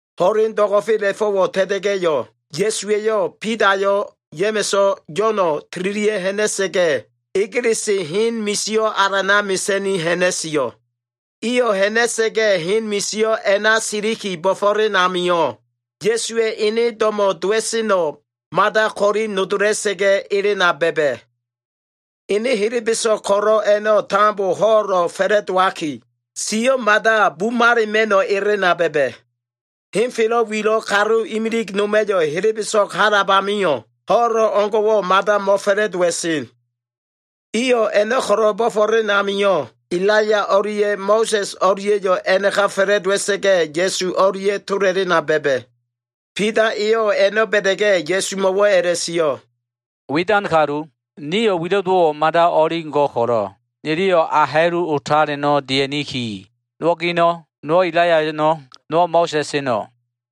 Ho꞉len do꞉go꞉fela꞉fo꞉wo꞉ ta꞉ta꞉ga꞉yo꞉, Ya꞉suwa꞉yo꞉ Bidayo꞉, Ya꞉ma꞉so꞉, Yo꞉no꞉ tililia꞉ ha꞉na꞉sa꞉ga꞉, egelese hen misio꞉ alana mesa꞉ni ha꞉na꞉sio꞉. Iyo꞉ ha꞉na꞉sa꞉ga꞉, hen misio꞉ a꞉na siliki bo꞉fo꞉len amio꞉, Ya꞉suwa꞉ ene do꞉mo꞉ dowa꞉seno꞉ mada ko꞉li nodola꞉sa꞉ga꞉ elena ba꞉ba꞉. Ene helebeso꞉g ko꞉lo꞉ a꞉no꞉ tambo ho꞉lo꞉ fa꞉la꞉dowaki, siyo꞉ mada bumalo꞉ elena ba꞉ba꞉. Henfelo꞉ wilo꞉ kalu imilig noma꞉yo꞉ helebeso꞉g halab amio꞉, ho꞉lo꞉ o꞉ngo꞉wo꞉ mada mo꞉fa꞉la꞉dowa꞉sen. Iyo꞉ a꞉no꞉ ko꞉lo꞉ bo꞉fo꞉len amio꞉, Elaiya o꞉lia꞉ Mo꞉sa꞉s o꞉lia꞉yo꞉ a꞉naka fa꞉la꞉dowa꞉sa꞉ga꞉, Ya꞉su o꞉lia꞉ tola꞉lena ba꞉ba꞉. Bida eyo꞉ a꞉no꞉ ba꞉da꞉ga꞉, Ya꞉sumo꞉wo꞉ a꞉la꞉sio꞉, “Widan kalu, nio꞉ wilo꞉ dowo꞉wo꞉ mada o꞉li go꞉ ko꞉lo꞉, niliyo꞉ a ha꞉lu otaleno꞉ dia꞉niki. Nowo꞉ gino꞉, nowo꞉ Elaiya eno꞉, nowo꞉ Mo꞉sa꞉s eno꞉.”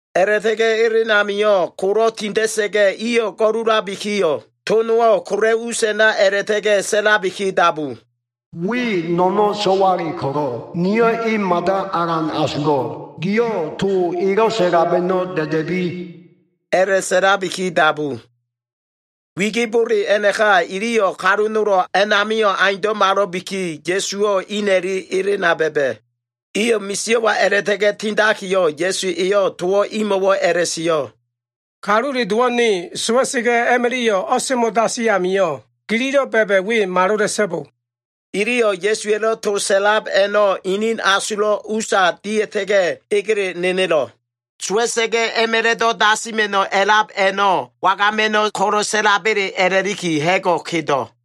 A꞉la꞉ta꞉ga꞉ elen amio꞉ kolo꞉ tinda꞉sa꞉ga꞉, iyo꞉ go꞉lulabikiyo꞉, to nowo꞉ kola꞉ us a꞉na a꞉la꞉ta꞉ga꞉ sa꞉labiki dabu. “We no꞉no꞉ so꞉wale ko꞉lo꞉, niyo꞉ e mada alan asulo꞉l. Gio꞉ to elo꞉ sa꞉lab a꞉no꞉ da꞉da꞉bi” a꞉la꞉sa꞉labiki dabu. Wigibole a꞉naka, iliyo꞉ kalu nolo꞉ a꞉namio꞉ aundo꞉malo꞉biki, Ya꞉suwo꞉ ina꞉li elena ba꞉ba꞉. Iyo꞉ misio꞉wa a꞉la꞉ta꞉ga꞉ tindakiyo꞉, Ya꞉su eyo꞉ towo꞉ imo꞉wo꞉ a꞉la꞉sio꞉, “Kalule Dowo꞉ ne sowa꞉sa꞉ga꞉ a꞉ma꞉la꞉yo꞉ o꞉semo꞉ dasi a꞉namio꞉, gililo꞉ ba꞉ba꞉ we malola꞉so꞉bo.” Iliyo꞉ Ya꞉suwa꞉lo꞉ to sa꞉lab a꞉no꞉, inin asulo꞉ usa dia꞉ta꞉ga꞉, egele nenelo꞉. Sowa꞉sa꞉ga꞉ a꞉ma꞉la꞉do꞉ dasima꞉no꞉ a꞉lab a꞉no꞉ wagama꞉no꞉ ko꞉lo꞉ sa꞉laba꞉le a꞉la꞉liki ha꞉go꞉ kedo꞉.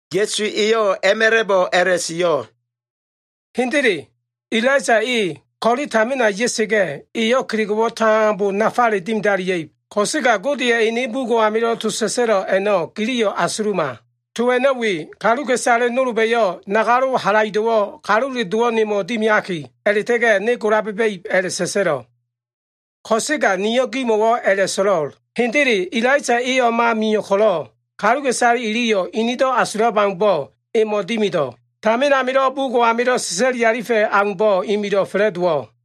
Ya꞉su eyo꞉ a꞉ma꞉la꞉bo꞉ a꞉la꞉sio꞉, “Hendele, Elaiya e ko꞉le tamina ya꞉sa꞉ga꞉yo꞉, eyo꞉ kelego꞉wo꞉ tambo nafale dimidalia꞉ib. Ko꞉sega Godeya꞉ ene bugo꞉ amilo꞉ to sa꞉sa꞉lo꞉ a꞉no꞉ giliyo꞉ asuluma. To a꞉no꞉ we, ‘Kaluka꞉isale nolba꞉yo꞉ nagalo꞉ halaido꞉wo꞉ Kalule Dowo꞉ nemo꞉ dimiaki a꞉la꞉ta꞉ga꞉ ne gola ba꞉ba꞉ib’ a꞉la꞉sa꞉sa꞉lo꞉. Ko꞉sega niyo꞉ gimo꞉wo꞉ a꞉la꞉so꞉lo꞉l, ‘Hendele Elaiya e o꞉ma mio꞉ ko꞉lo꞉, kaluka꞉isale iliyo꞉ inido꞉ asulab aumbo꞉ emo꞉ dimido꞉.’ Tamin amilo꞉ bugo꞉ amilo꞉ sa꞉sa꞉lifa꞉ aumbo꞉, imilo꞉ fa꞉la꞉dowo꞉.”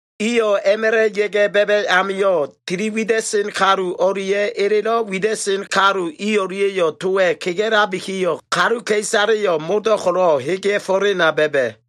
Iyo꞉ a꞉ma꞉la꞉ ya꞉ga꞉ ba꞉ba꞉ amio꞉, tili wida꞉sen kalu o꞉lia꞉ elelo꞉ wida꞉sen kalu i o꞉lia꞉yo꞉ towa꞉ kega꞉labikiyo꞉, kaluka꞉isaleyo꞉ modo꞉ ko꞉lo꞉ hegea꞉fo꞉lena ba꞉ba꞉.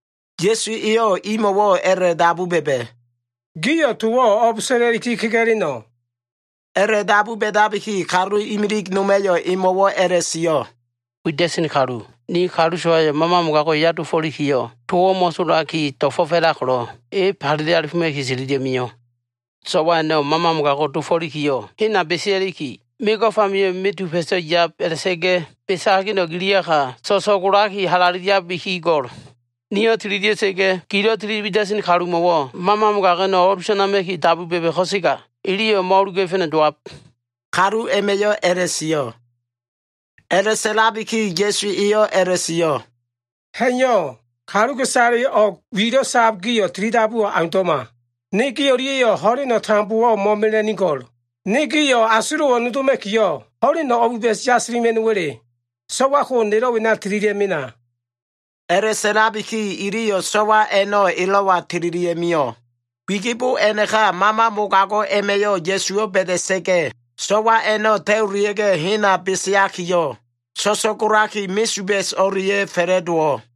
Ya꞉su eyo꞉ imo꞉wo꞉ a꞉la꞉dabu ba꞉ba꞉, “Gio꞉ towo꞉ o꞉b sa꞉la꞉liki kega꞉leno꞉?” A꞉la꞉dabu ba꞉dabiki kalu kegeo꞉ imilig noma꞉yo꞉ emo꞉wo꞉ a꞉la꞉sio꞉, “Wida꞉sen kalu, ni kalu so꞉wayo꞉ mama mogago꞉wo꞉ eya dofo꞉likiyo꞉, towo꞉ mo꞉tolaki do꞉fo꞉f a꞉lab ko꞉lo꞉, e falele alifoma꞉ki tililia꞉mio꞉. So꞉wa a꞉no꞉ mama mogago꞉ dofo꞉likiyo꞉, hena besea꞉liki, mego꞉f amio꞉ mesuba꞉so꞉ ya꞉b, a꞉la꞉ta꞉ga꞉ besa꞉ hageno꞉ giliyaka, so꞉so꞉golaki halaleliabiki go꞉l. Niyo꞉ tililia꞉sa꞉ga꞉, gilo꞉ tiliwida꞉sen kalumo꞉wo꞉ mama mogago꞉ a꞉no꞉ o꞉lusanama꞉ki dabu ba꞉ba꞉ ko꞉sega, iliyo꞉ mo꞉o꞉luga꞉fa꞉no꞉ dowab.” Kalu a꞉ma꞉yo꞉ a꞉la꞉sio꞉. A꞉la꞉sa꞉labiki Ya꞉su eyo꞉ a꞉la꞉sio꞉, “Ha꞉iyo꞉, kaluka꞉isale o꞉g wilo꞉ sab gio꞉ tilidabuwo꞉ aundo꞉ma. Ne gi o꞉lia꞉yo꞉ ho꞉leno꞉ tambowo꞉ mo꞉mela꞉nigo꞉l. Ne gio꞉ asulo꞉wo꞉ nodoma꞉kiyo꞉, ho꞉len o꞉biba꞉s yasilima꞉no꞉wa꞉le? So꞉wa ko nelo꞉ wena tililia꞉ mena.” A꞉la꞉sa꞉labiki iliyo꞉ so꞉wa a꞉no꞉ elo꞉wa tililia꞉mio꞉. Wigibo a꞉naka mama mogago꞉ a꞉ma꞉yo꞉ Ya꞉suwo꞉ ba꞉da꞉sa꞉ga꞉, so꞉wa a꞉no꞉ talulia꞉ga꞉ hena beseakiyo꞉, so꞉so꞉golaki mesuba꞉s o꞉lia꞉ fa꞉la꞉dowo꞉.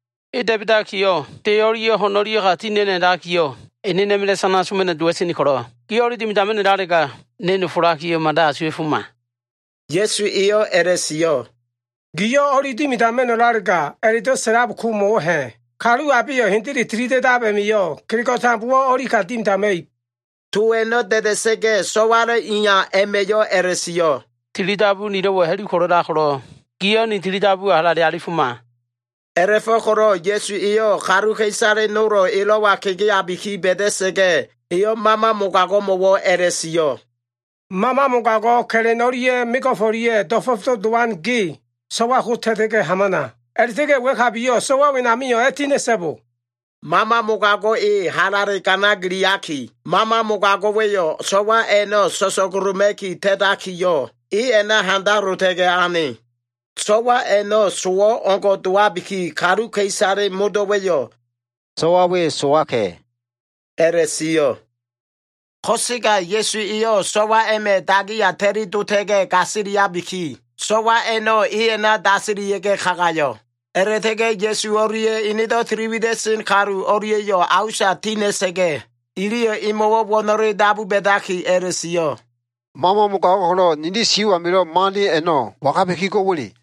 E da꞉ba꞉dakiyo꞉, de o꞉lia꞉ ho꞉n o꞉lia꞉ya ti ha꞉na꞉no꞉ a꞉lakiyo꞉, enenoma꞉la꞉ sana soma꞉no꞉ dowa꞉sen ko꞉lo꞉, giyo꞉ o꞉li dimidama꞉no꞉lalega, ne nofolakiyo꞉ mada asuwa꞉foma.” Ya꞉su eyo꞉ a꞉la꞉sio꞉, “Giyo꞉ ‘o꞉li dimidama꞉no꞉lalega’ a꞉la꞉do꞉ sa꞉lab ko mo꞉wo꞉ ha꞉? Kalu abeyo꞉ hendele tilida꞉dab a꞉ma꞉yo꞉ kelego꞉ tambowo꞉ o꞉li ka dimidama꞉ib.” To a꞉no꞉ da꞉da꞉sa꞉ga꞉, so꞉walo꞉ iya a꞉ma꞉yo꞉ a꞉la꞉sio꞉, “Tilidabu nilo꞉wo꞉ ha꞉lu ko꞉lo꞉lab ko꞉lo꞉, giyo꞉ ni tilidabuwo꞉ halale alifoma!” A꞉la꞉fo꞉ko꞉lo꞉ Ya꞉su eyo꞉ kaluka꞉isale nolo꞉ elo꞉wa kegeabiki ba꞉da꞉sa꞉ga꞉, eyo꞉ mama mogago꞉mo꞉wo꞉ a꞉la꞉sio꞉, “Mama mogago꞉ ka꞉la꞉n o꞉lia꞉ mego꞉f o꞉lia꞉ do꞉fo꞉fdo꞉ dowan ge, so꞉wa ko ta꞉ta꞉ga꞉ hamana. A꞉la꞉ta꞉ga꞉ wa꞉kabiyo꞉ so꞉wa wenamio꞉ a꞉tina꞉so꞉bo!” Mama mogago꞉ e halale ganagiliaki, mama mogago꞉wa꞉yo꞉ so꞉wa a꞉no꞉ so꞉so꞉goloma꞉ki ta꞉takiyo꞉, e a꞉na handalota꞉ga꞉ ane. So꞉wa a꞉no꞉ sowo꞉ o꞉ngo꞉ dowabiki, kaluka꞉isale modo꞉wa꞉yo꞉ “So꞉wa we sowaka꞉” a꞉la꞉sio꞉. Ko꞉sega Ya꞉su eyo꞉ so꞉wa a꞉ma꞉ dagiya ta꞉lidota꞉ga꞉ gasiliabiki, so꞉wa a꞉no꞉ e a꞉na dasilia꞉ga꞉ kagayo꞉. A꞉la꞉ta꞉ga꞉ Ya꞉su o꞉lia꞉ enedo꞉ tiliwida꞉sen o꞉lia꞉yo꞉ a usa ti ha꞉na꞉ga꞉, iliyo꞉ emo꞉wo꞉ wo꞉no꞉le dabu ba꞉daki a꞉la꞉sio꞉, “Mama mogago꞉ ko꞉lo꞉ nili sio꞉ amilo꞉ mo꞉ane a꞉no꞉ wangabiki go꞉wa꞉le?”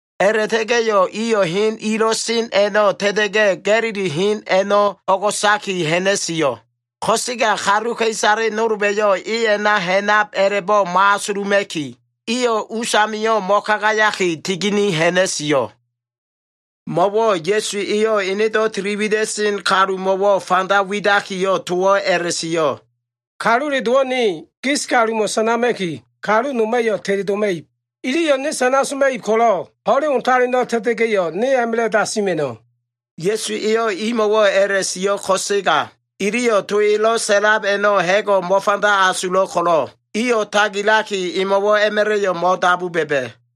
A꞉la꞉ta꞉ga꞉yo꞉ iyo꞉ hen ilo꞉ sen a꞉no꞉ ta꞉ta꞉ga꞉, Ga꞉lili hen a꞉no꞉ o꞉go꞉saki ha꞉na꞉sio꞉. Ko꞉sega kaluka꞉isale nolba꞉yo꞉ e a꞉na ha꞉nab a꞉la꞉bo꞉ mo꞉asuluma꞉ki, iyo꞉ us amio꞉ mo꞉kagayaki, tigini ha꞉na꞉sio꞉. Mo꞉wo꞉ Ya꞉su eyo꞉ enedo꞉ tili wida꞉sen kalumo꞉wo꞉ fanda widakiyo꞉ towo꞉ a꞉la꞉sio꞉. “Kalule Dowo꞉ ne, gis kalumo꞉ sana soma꞉ki, kalu noma꞉yo꞉ teledoma꞉ib. Iliyo꞉ ne sana soma꞉ib ko꞉lo꞉, ho꞉len otaleno꞉ ta꞉ta꞉sa꞉ga꞉yo꞉, ne a꞉ma꞉la꞉ dasima꞉no꞉.” Ya꞉su eyo꞉ imo꞉wo꞉ a꞉la꞉sio꞉ ko꞉sega, iliyo꞉ to elo꞉ sa꞉lab a꞉no꞉ ha꞉go꞉ mo꞉fanda asulo꞉ ko꞉lo꞉, iyo꞉ tagilaki, emo꞉wo꞉ a꞉ma꞉la꞉yo꞉ mo꞉dabu ba꞉ba꞉.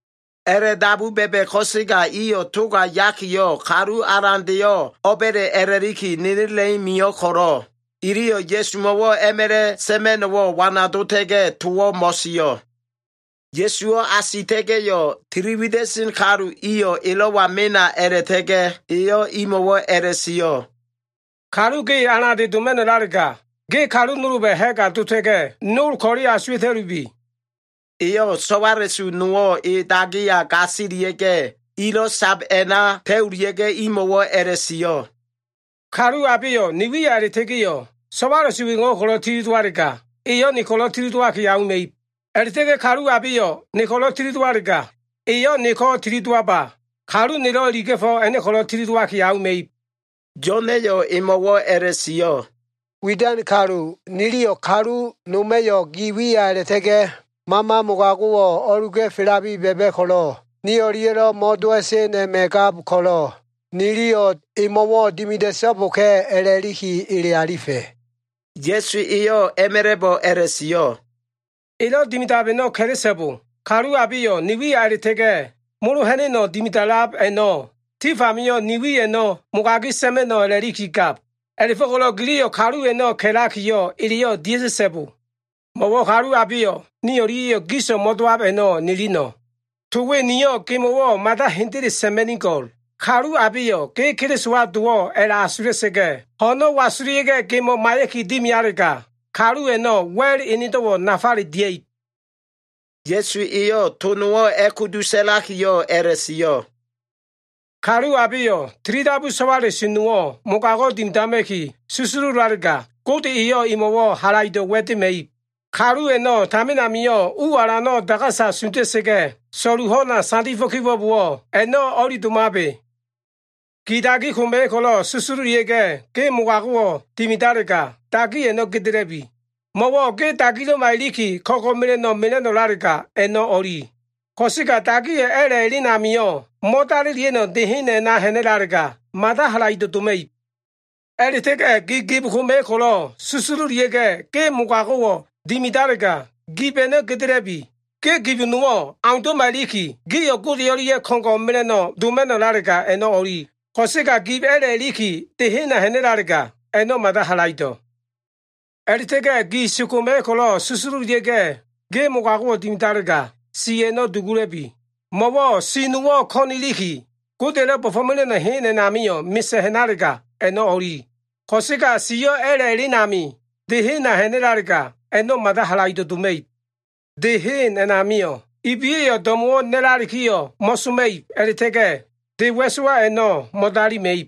A꞉la꞉dabu ba꞉ba꞉ ko꞉sega iyo꞉ toga yakiyo꞉, kalu alandeyo꞉ o꞉ba꞉le a꞉la꞉liki nenela꞉i mio꞉ ko꞉lo꞉, iliyo꞉ Ya꞉sumo꞉wo꞉ a꞉ma꞉la꞉ sa꞉ma꞉no꞉wo꞉ wanadota꞉ga꞉, towo꞉ mo꞉sio꞉. Ya꞉suwo꞉ asita꞉ga꞉yo꞉, tili wida꞉sen kalu iyo꞉ elo꞉wa mena a꞉la꞉ta꞉ga꞉ eyo꞉ imo꞉wo꞉ a꞉la꞉sio꞉, “Kalu ge alande doma꞉no꞉lalega, ge kalu nolba꞉ ha꞉ga dota꞉ga꞉, nol ko꞉le asuwa꞉ta꞉lubi.” Eyo꞉ so꞉wala꞉su nowo꞉ e dagiya gasilia꞉ga꞉, ilo꞉ sab a꞉na ta꞉ulia꞉ga꞉, imo꞉wo꞉ a꞉la꞉sio꞉, “Kalu abeyo꞉ ne wiya a꞉la꞉ta꞉ga꞉yo꞉, so꞉wala꞉su wengo꞉wo꞉ sagala꞉sa꞉ga꞉ tili dowalega, eyo꞉ ne ko꞉lo꞉ tili dowaki auma꞉ib. A꞉la꞉ta꞉ga꞉ kalu abeyo꞉ ne ko꞉lo꞉ tili dowalega, eyo꞉ neko꞉ tili dowaba, kalu nelo꞉ iliga꞉fo꞉ a꞉no꞉ ko꞉lo꞉ tili dowaki auma꞉ib.” Yo꞉n eyo꞉ emo꞉wo꞉ a꞉la꞉sio꞉, “Widan kalu, niliyo꞉ kalu noma꞉yo꞉ gi wiya a꞉la꞉ta꞉ga꞉ mama mogago꞉wo꞉ o꞉luga꞉felabi ba꞉ba꞉ ko꞉lo꞉, ni o꞉lia꞉lo꞉ mo꞉dowa꞉sen a꞉ma꞉ gab ko꞉lo꞉, niliyo꞉ emo꞉wo꞉ dimida꞉so꞉boka꞉ a꞉la꞉liki ele alifa꞉.” Ya꞉su eyo꞉ a꞉ma꞉la꞉bo꞉ a꞉la꞉sio꞉, “Elo꞉ dimidab a꞉no꞉ ka꞉la꞉so꞉bo. Kalu abeyo꞉ ni wiya a꞉la꞉ta꞉ga꞉ molo ha꞉na꞉no꞉ dimida꞉lab a꞉no꞉, tif amio꞉ ne wi a꞉no꞉ mo꞉mogagi sa꞉ma꞉no꞉ a꞉la꞉liki gab. A꞉la꞉fo꞉ko꞉lo꞉ giliyo꞉ kalu a꞉no꞉ ka꞉lakiyo꞉ eleyo꞉ dia꞉ta꞉so꞉bo. Mo꞉wo꞉ kalu abeyo꞉ ni o꞉lia꞉yo꞉ giso꞉ mo꞉dowab a꞉no꞉ nilino꞉. To we niyo꞉ gemo꞉wo꞉ mada hendele sa꞉ma꞉nigo꞉l. Kalu abeyo꞉ ge Kelisowa dowo꞉ a꞉la꞉asula꞉sa꞉ga꞉, ho꞉no꞉ wasulia꞉ga꞉ gemo꞉ maiya꞉ki dimialega, kalu a꞉no꞉ wa꞉l enedo꞉wo꞉ nafale dia꞉ib.” Ya꞉su eyo꞉ to nowo꞉ a꞉kudu sa꞉lakiyo꞉ a꞉la꞉sio꞉, “Kalu abeyo꞉ tilidabu so꞉wala꞉su nowo꞉ mogago꞉ dimidama꞉ki susululalega, Gode eyo꞉ emo꞉wo꞉ halaido꞉ wa꞉dema꞉ib. Kalu a꞉no꞉ tamin amio꞉ u alano꞉ dagasa sunda꞉sa꞉ga꞉, so꞉lu ho꞉na sandifo꞉ kibo꞉bowo꞉, a꞉no꞉ o꞉li domabe. Gi dagi koma꞉yo꞉ ko꞉lo꞉ susululia꞉ga꞉, ge mogago꞉wo꞉ dimidalega, dagi a꞉no꞉ gedela꞉bi. Mo꞉wo꞉ ge dagilo꞉ma iliki, ko꞉ngo꞉ mela꞉no꞉ mela꞉no꞉lalega, a꞉no꞉ o꞉li. Ko꞉sega dagiyo꞉ a꞉la꞉ elen amio꞉, mo꞉dalilia꞉no꞉ de hen a꞉na ha꞉nalega, mada halaido꞉ doma꞉ib. A꞉la꞉ta꞉ga꞉ gi gib koma꞉yo꞉ ko꞉lo꞉ susululia꞉ga꞉, ge mogago꞉wo꞉ dimidalega, gib a꞉no꞉ gedela꞉bi. Ge gib nowo꞉ aundo꞉ma iliki, gio꞉ Gode o꞉lia꞉ ko꞉ngo꞉ mela꞉no꞉ doma꞉no꞉lalega, a꞉no꞉ o꞉li. Ko꞉sega gibo꞉ a꞉la꞉ iliki, de hena ha꞉nalega, a꞉no꞉ mada halaido꞉. A꞉la꞉ta꞉ga꞉ gi si koma꞉yo꞉ ko꞉lo꞉ susululia꞉ga꞉, ge mogago꞉wo꞉ dimidalega, si a꞉no꞉ dugula꞉bi. Mo꞉wo꞉ si nowo꞉ ko꞉n iliki, Godeya꞉lo꞉ bo꞉fo꞉lab hen a꞉namio꞉ mesa꞉ ha꞉nalega, a꞉no꞉ o꞉li. Ko꞉sega siyo꞉ a꞉la꞉ elen amio꞉ de hena ha꞉nalega, a꞉no꞉ mada halaido꞉ doma꞉ib. De hen a꞉namio꞉, “ ‘ibiya꞉yo꞉ do꞉mo꞉wo꞉ na꞉lalikiyo꞉ mo꞉soma꞉ib a꞉la꞉ta꞉ga꞉, de wa꞉sowa a꞉no꞉ mo꞉dalima꞉ib.’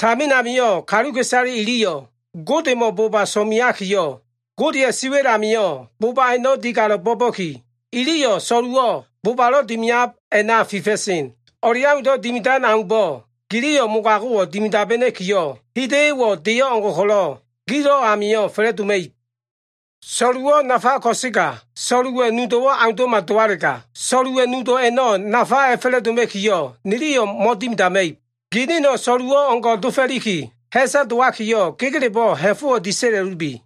Tamin amio꞉ kaluka꞉isale iliyo꞉ Godemo꞉ boba so꞉meakiyo꞉, Godeya꞉ siwa꞉l amio꞉ boba a꞉no꞉ digalo꞉ bo꞉ba꞉ki, iliyo꞉ so꞉luwo꞉ bobalo꞉ dimiab a꞉na fifa꞉sen. O꞉leaundo꞉ dimidan aumbo꞉ giliyo꞉ mogago꞉wo꞉ dimidabena꞉kiyo꞉, hida꞉yo꞉wo꞉ deyo꞉ o꞉ngo꞉ ko꞉lo꞉ gilo꞉ amio꞉ fa꞉la꞉doma꞉ib. “So꞉luwo꞉ nafa ko꞉sega, so꞉luwa꞉ nudo꞉wo꞉ aundo꞉ma dowalega, so꞉luwa꞉ nudo꞉ a꞉no꞉ nafa a꞉fa꞉la꞉doma꞉kiyo꞉, niliyo꞉ mo꞉dimidama꞉ib. Ginino꞉ so꞉luwo꞉ o꞉ngo꞉ dofo꞉liki, ha꞉sa dowakiyo꞉ gegelebo꞉ ha꞉fo꞉wo꞉ disa꞉la꞉lubi.”